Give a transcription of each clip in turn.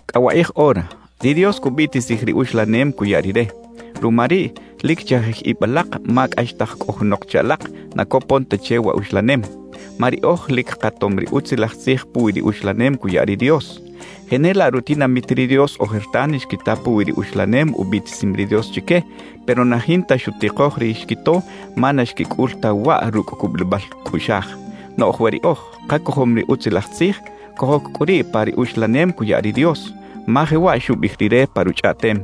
Cꞌa wakꞌij ora, ri Dios cubiꞌtisij ri uxlanem cuya Rire. Ruma riꞌ, lic chajij ib alak ma cꞌaxtaj cꞌo junok che alak na copon ta che wa uxlanem. Ma riꞌoj lic katom ri Utzilaj Tzij puwi ri uxlanem cuya ri Dios. Jenelaꞌ rutinamit ri Dios ojertan xquita puwi ri uxlanem ubiꞌtisim ri Dios chique; pero na jinta xutikoj ri xquito, ma na xquicꞌul ta waꞌ rucꞌ cubulibal cꞌuꞌxaj. Noꞌj we riꞌoj kacojom ri Utzilaj Tzij, cojoc cꞌu riꞌ pa ri uxlanem cuya ri Dios. Ma jewaꞌ xubiꞌij Rire pa Ruchꞌaꞌtem: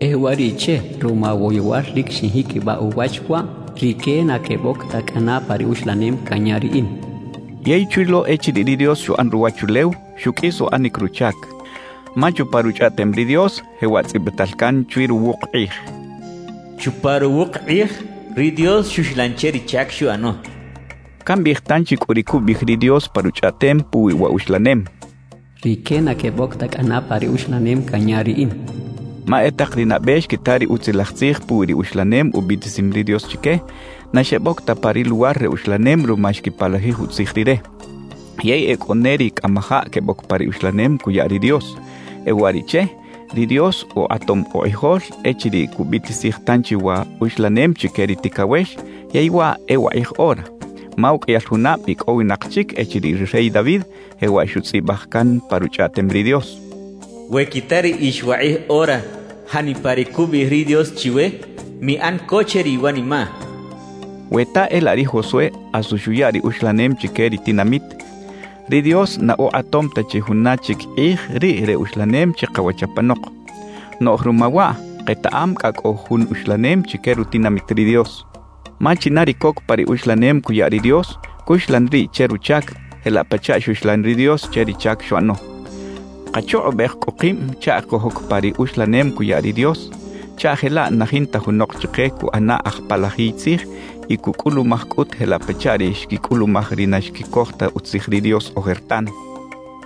E uwariꞌche, ruma woyowal lic xinjiquibaꞌ uwach waꞌ: “Rique na queboc ta cꞌana pa ri uxlanem canya Riꞌin” xchaꞌ. Yey chwi lo echiriꞌ ri Dios xuꞌan ruwachulew, xuqꞌuis uꞌanic ruchac. Ma chupa Ruchꞌaꞌtem ri Dios jewaꞌ tzꞌibital can chwi ruwuk kꞌij: Chupa ruwuk kꞌij ri Dios xuxlan che ri chac xuꞌano. Cambiꞌij tanchi cꞌu ri cubiꞌij ri Dios pa Ruchꞌaꞌtem puwi wa uxlanem: «Rique na queboc ta cꞌana pa ri uxlanem canya Riꞌin» cachaꞌ. Ma e tak ri nabe xquita ri Utzilaj Tzij puwi ri uxlanem ubiꞌtisim ri Dios chique, na xeboc ta pa ri luwar re uxlanem ruma xquipalajij utzij Rire. Yey e cꞌo ne ri cꞌamajaꞌ queboc pa ri uxlanem cuya ri Dios. E uwariꞌche, ri Dios ukꞌatom ukꞌijol echiriꞌ cubiꞌtisij tanchi wa uxlanem chique ri ticawex, yey waꞌ e “wakꞌij ora”. Ma uqꞌuiyal junab icꞌowinak chic echiriꞌ ri rey David jewaꞌ xutzꞌibaj can pa Ruchꞌaꞌtem ri Dios: We quita riꞌix wakꞌij ora janipa ri cubiꞌij ri Dios chiwe, miꞌan co che ri iwanimaꞌ xchaꞌ. We ta e laꞌ ri Josué asu xuya ri uxlanem chique ri tinamit, ri Dios na ukꞌatom ta chi juna chic kꞌij riꞌ re uxlanem chikawach apanok. Noꞌj ruma waꞌ, ketaꞌam cꞌa cꞌo jun uxlanem chique rutinamit ri Dios. Ma china ri coc pa ri uxlanem cuya ri Dios, cuxlan riꞌ che ruchac, jelaꞌ pachaꞌ xuxlan ri Dios che ri chac xuꞌano. Kachukꞌubej cꞌu kib chaꞌ cojoc pa ri uxlanem cuya ri Dios, chaꞌ jelaꞌ na jinta junok chike cuꞌana aj palajiy tzij y cucꞌulumaj cꞌut jelaꞌ pachaꞌ ri xquicꞌulumaj ri na xquicoj ta utzij ri Dios ojertan.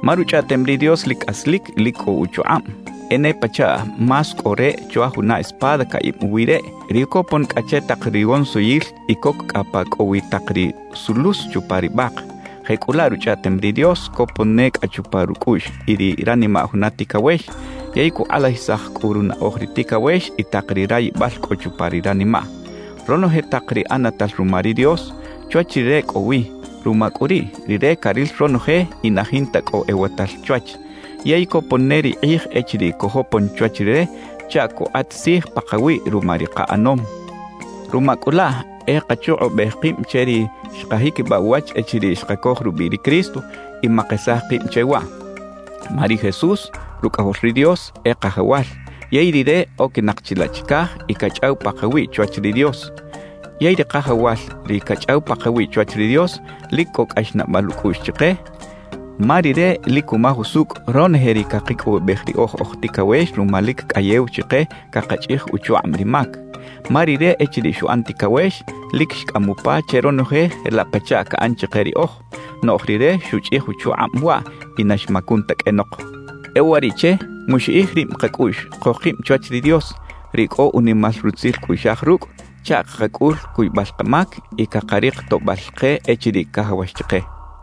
Ma Ruchꞌaꞌtem ri Dios lic cꞌaslic y lic cꞌo uchukꞌab. E ne pachaꞌ más cꞌo reꞌ chwa juna espada caꞌib uwi reꞌ, ri copon cꞌa che tak rigonsiyil y coc cꞌa pa cꞌo wi tak ri sulus chupa ri bak. Jecꞌulaꞌ Ruchꞌaꞌtem ri Dios copon ne cꞌa chupa rucꞌuꞌx y ri ranimaꞌ juna ticawex, yey cukꞌalajisaj cꞌu runaꞌoj ri ticawex y tak ri rayibal cꞌo chupa ri ranimaꞌ. Ronoje tak ri ꞌanatal ruma ri Dios, chwach Rire cꞌo wi. Ruma cꞌu riꞌ, Rire caril ronoje y na jinta cꞌo ewatal chwach. Yey copon ne ri kꞌij echiriꞌ cojopon chwach Rire chaꞌ cukꞌat tzij pakawiꞌ ruma ri kaꞌanom. Ruma cꞌu laꞌ e kachukꞌubej kib che ri xkajiquibaꞌ uwach echiriꞌ xkacoj rubiꞌ ri Cristo y makesaj kib che waꞌ. Ma ri Jesús, Rucꞌajol ri Dios, e Kajawal; yey Rire oquinak chilaꞌ chicaj y cachꞌaw pakawiꞌ chwach ri Dios. Yey ri Kajawal, ri cachꞌaw pakawiꞌ chwach ri Dios, lic cꞌo cꞌaxnaꞌbal ucꞌuꞌx chike, ma Rire lic cumaj usucꞌ ronoje ri cakicꞌowibej riꞌoj oj ticawex ruma lic cꞌayew chike cakachꞌij uchukꞌab ri mac. Ma Rire echiriꞌ xuꞌan ticawex, lic xcꞌam upa che ronoje jelaꞌ pachaꞌ caꞌan chike riꞌoj, noꞌj Rire xuchꞌij uchukꞌab waꞌ y na xmacun ta qꞌuenok. E uwariꞌche, muxiꞌij rib kacꞌuꞌx cojkib chwach ri Dios, ri cꞌo unimal rutzil cꞌuꞌxaj rucꞌ, chaꞌ cakacꞌul cuybal kamac y cakarik toꞌbal ke echiriꞌ cajawax chike.